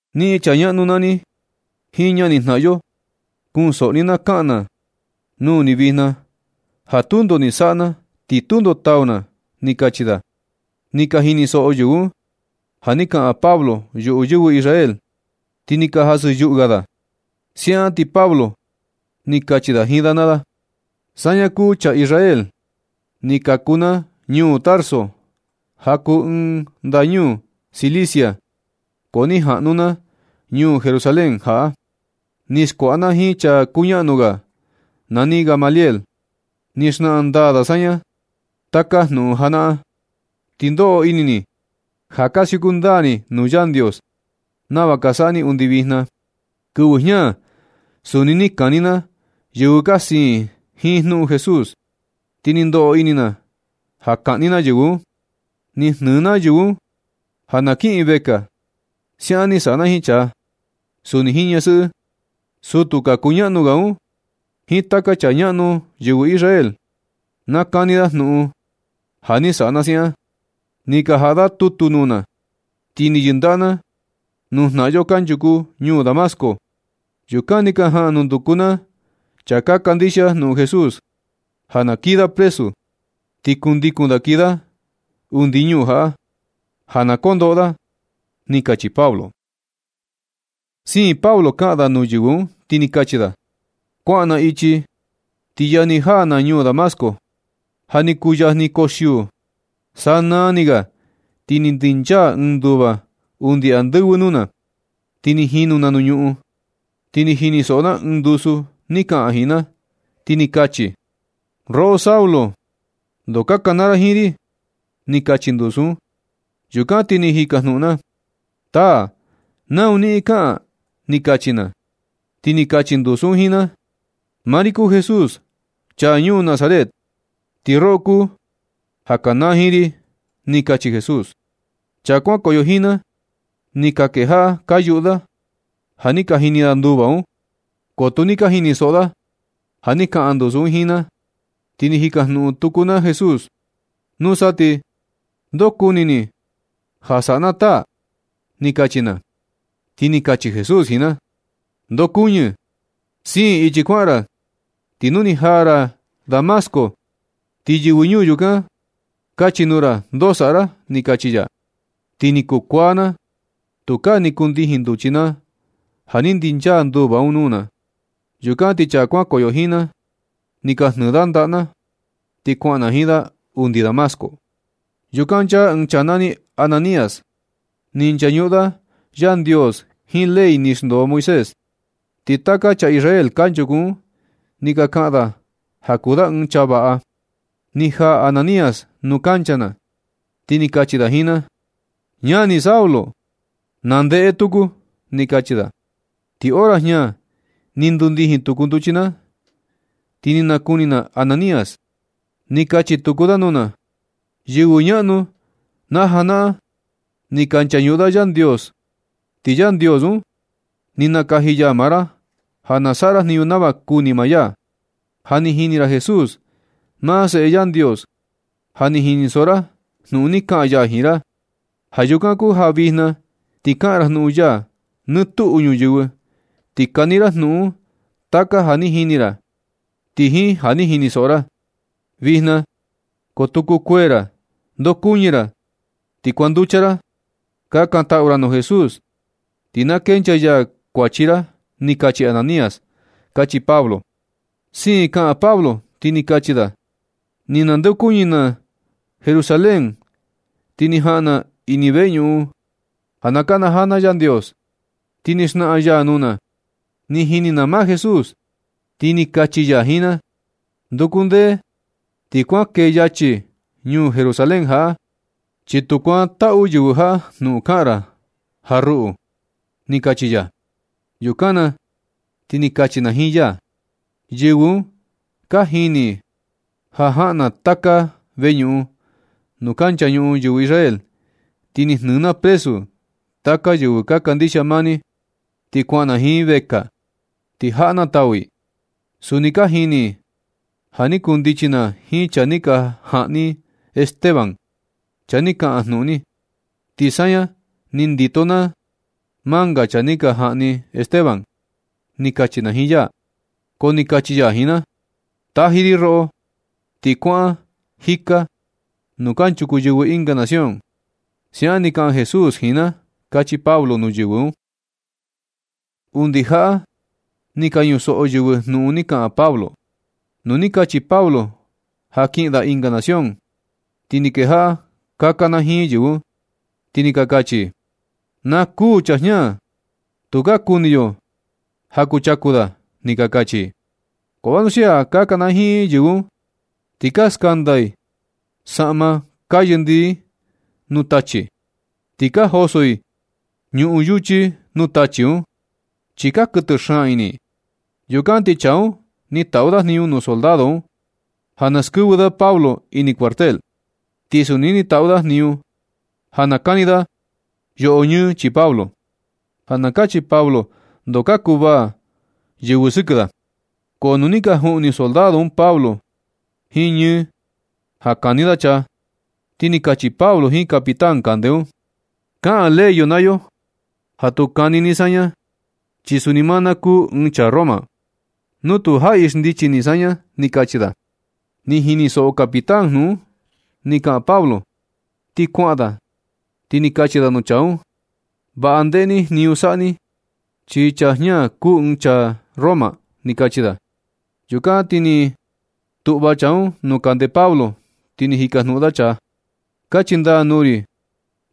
―Niꞌin chaa ñaꞌnu naa ni jiin ñanijnaꞌan yo, kunsoꞌo ni na kaꞌan na nuu ni vijna ja tundo ni saꞌa na, ni tundo tau na ―ni kachi da. Ni ka jinisoꞌo yɨvɨ un ja ni kaꞌan Pablo yuꞌu yɨvɨ Israel, ti ni ka jasɨ yuꞌu ga da. Siaꞌan ti Pablo ni kachi da jiin da naa da: ―Saña kuu chaa Israel. Ni kaku na ñuu Tarso, ja kuu ɨɨn ndañuu Cilicia, ko ni jaꞌnu na ñuu Jerusalén jaꞌa. Ni skuaꞌa na jiin chaa kuñaꞌnu ga nani Gamaliel. Ni xnaꞌan ndaa da saña taka jnuꞌun najanaꞌan. Ti ndoꞌo ini ni ja ka siuku ndaa ni nuu Yandios nava ka saꞌa ni undi vijna. Kɨvɨ jña suni ni kani na yɨvɨ ka siin jiin jnuꞌun Jesús, ti ni ndoꞌo ini na ja kaꞌni na yɨvɨ un. Ni jnɨɨ na yɨvɨ un ja na kiꞌin i vekaa. Siaꞌan ni saꞌa na jiin chaa, suni jiin ñasɨꞌɨ. Sutu kuñaꞌnu ga un, jiin taka chaa ñaꞌnu yɨvɨ Israel, na kani da jnuꞌun ja ni saꞌa na siaꞌan. Ni ka jaꞌa da tutu nuu na, ti ni yɨndaꞌa na nuu jnaꞌan yo kanchuku ñuu Damasco. Yukan ni ka jaꞌan nunduku na chaa ka kandixia jnuꞌun Jesús, ja na kii da presu. Ti kundikun da kii da undi ñuu jaꞌa, ja na kondoꞌo da ―ni kachi Pablo. Siin Pablo kaꞌan da nuu yɨvɨ un, ti ni kachi da: ―Kuaꞌan na ichi, ti yajni jaa na ñuu Damasco, ja ni kuu yajni koxiuu. Sanaa ni ga ti ni ndinchaa ɨɨn nduva undi andɨvɨ nuu na. Ni jinu na nuu ñuꞌun, ti ni jinisoꞌo na ɨɨn ndusu ni kaꞌan jiin na, ti ni kachi: “Roꞌo Saulo, ndoo ka kanaa ra jiin ri”, ni kachi ndusu un. Yukan ti ni jikajnuꞌun na: “Taa, ¿nau niꞌin kaꞌan”? ni kachi na. Ti ni kachi ndusu un jiin na: “Maa ri kuu Jesús, chaa ñuu Nazaret, ti roꞌo kuu ja ka kanaa jiin ri”, ni kachi Jesús. Chaa kuankoyo jiin na, ni ka kejaꞌa ka yuꞌu da ja ni jini da nduva un, ko tu ni ka jinisoꞌo da ja ni kaꞌan ndusu un jiin na. Ti ni jikajnuꞌun tuku na Jesús: “Nusa ti ¿ndoo kuni ni ja saꞌa na, taa”? ni kachi na. Ti ni kachi Jesús jiin na: “Ndokuñɨ, siin ichi kuaꞌan ra, ti nu ni jaa ra Damasco, ti yɨvɨ ñuu yukan kachi nuu ra ndoo saꞌa ra”, ni kachi ri ya. Ti ni kuu kuaa na, tukaa ni kundijin nduchi na ja ni ndinchaa nduva un nuu na. Yukan ti chaa kuankoyo jiin na, ni ka jnɨ da ndaꞌa na, ti kuaꞌan na jiin da undi Damasco. Yukan nchaa ɨɨn chaa nani Ananías. Ni nchañuꞌun da Yandios jiin ley ni xndoo Moisés. Ti taka chaa Israel kanchuku un ni ka kaꞌan da ja kuu da ɨɨn chaa vaꞌa. Ni jaa Ananías nuu kancha na, ti ni kachi da jiin na: “Ñani Saulo, na ndeꞌe tuku”, ni kachi da. Ti hora jña ni ndundijin tuku nduchi na ti ni nakuni na Ananías. Ni kachi tuku da nuu na: “Yɨvɨ ñaꞌnu yo na janaꞌan ni ka nchañuꞌun da Yandios, ti Yandios un ni nakaji ya maa ra ja saꞌa ra jniñu nava kuni maa ya. Ja ni jini ra Jesús, maa Seꞌe Yandios. Ja ni jinisoꞌo ra jnuꞌun ni kaꞌan ya jiin ra. Ja yukan kuu ja vijna ti kaꞌan ra jnuꞌun ya nɨ tuꞌu ñuyɨvɨ, ti kani ra junꞌun taka ja ni jini ra, ti jiin ja ni jinisoꞌo ra. Vijna, ko tu kukuee ra, ndokuɨñɨ ra, ti kuanducha ra. Kakantaꞌu ra nuu Jesús, ti na kenchaa ya kuachi ra”, ni kachi Ananías ―kachi Pablo. Siin kaꞌan Pablo, ti ni kachi da: ―Ni nandeokuñɨ na Jerusalén, ti ni jaꞌan na ini veñuꞌun ja na kanajaa na Yandios, ti ni naxnaꞌan ya nuu na. Ni jini na maa Jesús, ti ni kachi ya jiin na: “Nduku ndee ti kuan kee yachi ñuu Jerusalén jaꞌa, chi tu saꞌa yɨvɨ jaꞌa jnuꞌun kaꞌan ra ja ruꞌu”, ni kachi ya. Yukan na ti ni kachi na jiin ya: “Yɨvɨ un ka jini i ja jaꞌan na taka veñuꞌun nuu ka nchañuꞌun yɨvɨ Israel, ti ni jnɨ na presu taka yɨvɨ ka kandixia maa ni, ti kuaꞌan na jiin i vekaa, ti jaꞌa na tau i. Suni ka jini i ja ni kundichi na jiin chaa ni ka jaꞌni Esteban, chaa ni kaꞌan jnuꞌun ni. Ti saña ni ndito na manga chaa ni ka jaꞌni Esteban”, ni kachi na jiin ya. Ko ni kachi ya jiin na: “Taji ri roꞌo ti kuaꞌan jika nuu kanchuku yɨvɨ ɨnga nación.” Siaꞌan ni kaꞌan Jesús jiin na ―kachi Pablo nuu yɨvɨ un. Undi jaꞌa ni ka ñusoꞌo yɨvɨ jnuꞌun ni kaꞌan Pablo. Nu ni kachi Pablo ja kiꞌin da ɨnga nación, ti ni kejaꞌa ka kanajiin yɨvɨ un, ti ni ka kachi i: ―¡Na kuū chaa jña, tukaa kuni yo ja kuchaku da! ―ni ka kachi i. Ko vanuxia ka kanajiin yɨvɨ un, ti ka skanda i saꞌma ka yɨndii i nuu tachi, ti ka joso i ñuꞌun yuchi nuu tachi un, chi ka kuɨtɨ xaan ini i. Yukan ti chaa un ni taꞌu da jniñu nuu soldado un ja na naxndɨvɨ da Pablo ini cuartel. Ti suni ni taꞌu da jniñu ja na kani da yoꞌo ñɨɨ chii Pablo, ja na kachi Pablo ndoo ka kuvaa yɨvɨ sɨkɨ da. Ko nu ni ka juꞌni soldado un Pablo jiin ñɨ, ja kani da chaa, ti ni kachi Pablo jiin capitán kande un: ―Kaꞌan ley yo naa yo ja tu kuu kani ni saña, chi suni maa na kuu ɨɨn chaa Roma nu tu jaꞌi xndichi ni saña ―ni kachi da. Ni jinisoꞌo capitán jnuꞌun ni kaꞌan Pablo, ti kuaꞌan da, ti ni kachi da nuu chaa un: ―Vaꞌa ndeꞌe ni jniñu saꞌa ni, chi chaa jña kuu ɨɨn chaa Roma ―ni kachi da. Yukan na ti ni tuꞌva chaa un nuu kande Pablo, ti ni jikajnuꞌun da chaa: ―Kachi ndaa nuu ri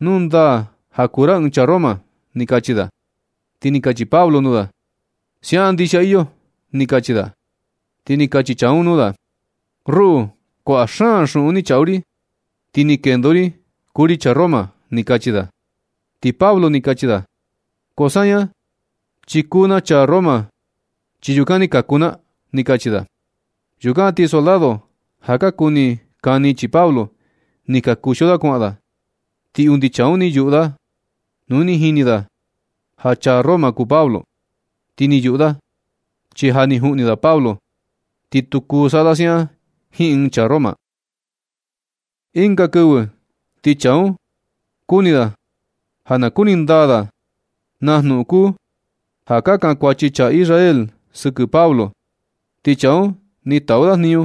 nu ndaa ja kuu ra ɨɨn chaa Roma ―ni kachi da. Ti ni kachi Pablo nuu da: ―Siaꞌan ndixia iyo ―ni kachi da. Ti ni kachi chaa un nuu da: ―Ruꞌu, kuaꞌa xuꞌun ni chaꞌu ri, ti ni kendo ri kuu ri chaa Roma ―ni kachi da. Ti Pablo ni kachi da: ―Ko saña chi kuu na chaa Roma, chi yukan ni kaku na ―ni kachi da. Yukan ti soldado ja ka kuni kani chii Pablo, ni ka kuxio da kuaꞌan da. Ti undi chaa un ni yuꞌu nu ni jini ja chaa Roma kuu Pablo, ti ni yuꞌu da, chi ja ni juꞌni da Pablo. Ti tu kuu saꞌa da siaꞌan jiin ɨɨn chaa Roma. Ɨnga kɨvɨ, ti chaa un, kuni da ja na kuni ndaa da na jnuꞌun kuu ja ka kankuachi chaa Israel sɨkɨ Pablo. Ti chaa un ni taꞌu da jniñu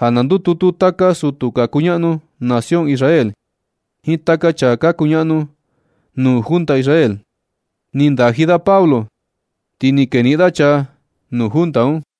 ja na ndututu taka sutu ka kuñaꞌnu nación Israel jiin taka chaa ka kuñaꞌnu nuu junta Israel. Ni ndaji da Pablo, ti ni keniꞌin da chaa nuu junta un.